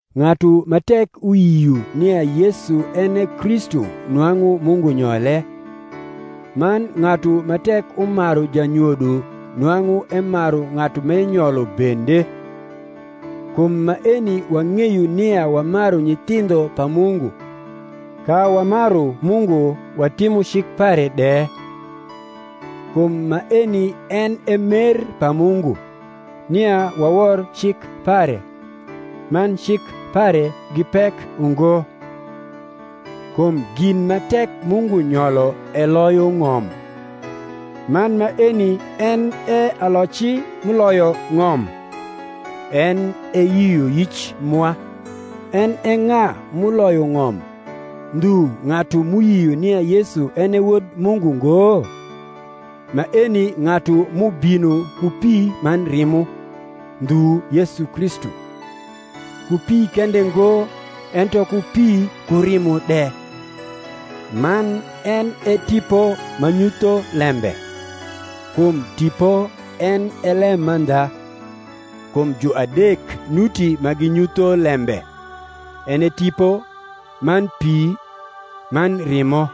Ng’atu ma tek uyio nia Yesu en e Kristu nwang’u Mungu nyole: man ng’atu ma tek umaru janyodo nwang’u emaru ng’atu m’euyolo bende. Kum maeni wang’eyo nia wamaru nyithindho pa Mungu, ka wamaru Mungu watimo cik pare de. Kum maeni en e mer pa Mungu, nia wawor cik pare: man cik pare gi pek ungo. Kum gin ma tek Mungu nyolo eloyo ng’om: man maeni en e aloci m’uloyo ng’om, en e yioyic mwa. En e ng’a m’uloyo ng’om, ndhu ng’atu m’uyio nia Yesu en e Wod Mungu ngo? Maeni ng’atu m’ubino ku pi man rimo, ndhu Yesu Kristu; ku pi kende ngo, ento ku pi ku rimo de. Man en e Tipo ma nyutho lembe, kum Tipo en e lemandha. Kum juadek nuti ma ginyutho lembe, en e Tipo, man pi, man rimo: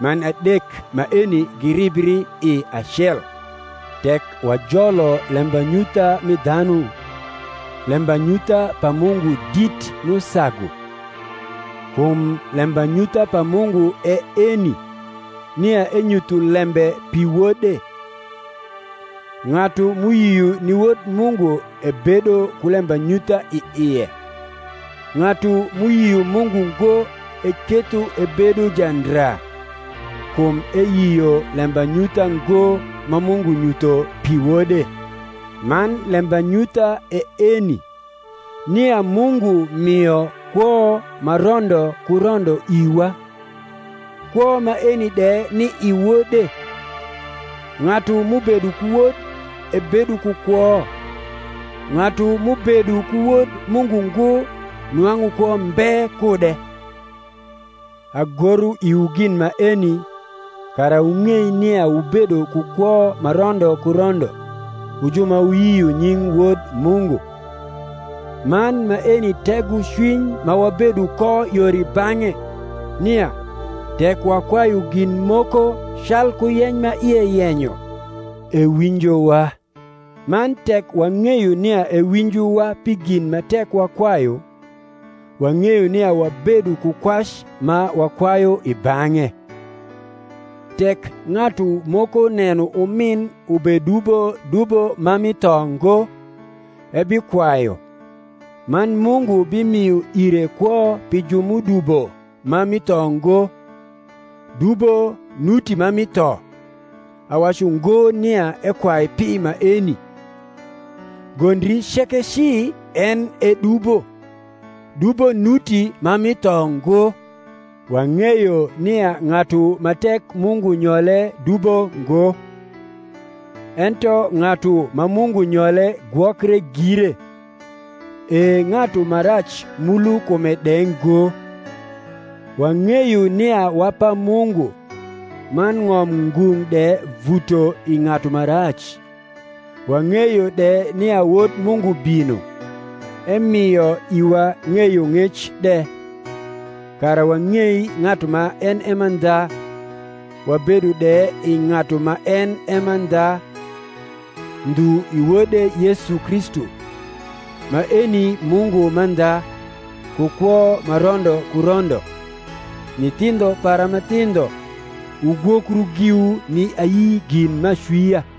man adek maeni giribri i acel. Tek wajolo lembanyutha mi dhanu, lembanyutha pa Mungu dit m’usagu: kum lembanyutha pa Mungu e eni, nia enyutho lembe pi Wode. Ng’atu m’uyio ni Wod Mungu ebedo ku lembanyutha i ie: ng’atu m’uyio Mungu ngo eketho ebedo jandra; kum eyio lembanyutha ngo ma Mungu nyutho pi Wode. Man lembanyutha e eni, nia Mungu mio kwo ma rondo ku rondo iwa, kwo maeni de ni i Wode. Ng’atu m’ubedo ku Wod ebedo ku kwo; ng’atu m’ubedo ku Wod Mungu ngo nwang’u kwo mbe kude. Agoro iwu gin maeni, kara wung’ei nia wubedo ku kwo ma rondo ku rondo, wu ju ma wuyio nying Wod Mungu. Man maeni tegocwiny ma wabedo ko yor i bang’e, nia, tek wakwayu gin moko calku yeny ma ie yenyo, ewinjowa: man tek wang’eyo nia ewinjowa pi gin ma tek wakwayu, wang’eyo nia wabedo ku kwac ma wakwayu i bang’e. Tek ng’atu moko neno umin ubedubo dubo ma mi tho ngo, ebikwayu, man Mungu bimio ire kwo pi ju m’udubo ma mi tho ngo. Dubo nuti ma mi tho: awacu ngo nia ekwai pi maeni. Gondri ceke ci en e dubo: dubo nuti ma mi tho ngo. Wang’eyo nia ng’atu ma tek Mungu nyole dubo ngo; ento ng’atu ma Mungu nyole gwokre gire, e ng’atu ma rac mulo kume de ngo. Wang’eyo nia wa pa Mungu, man ng’om ngung’ de vuto i ng’atu ma rac. Wang’eyo de nia Wod Mungu bino, emio iwa ng’eyong’ec de, kara wang’ei ng’atu ma en e mandha, wabedo de i ng’atu ma en e mandha, ndhu i Wode Yesu Kristu. Maeni Mungu mandha, ku kwo ma rondo ku rondo. Nyithindho para ma thindho, wugwokru giwu ni ayi gin m’acwia.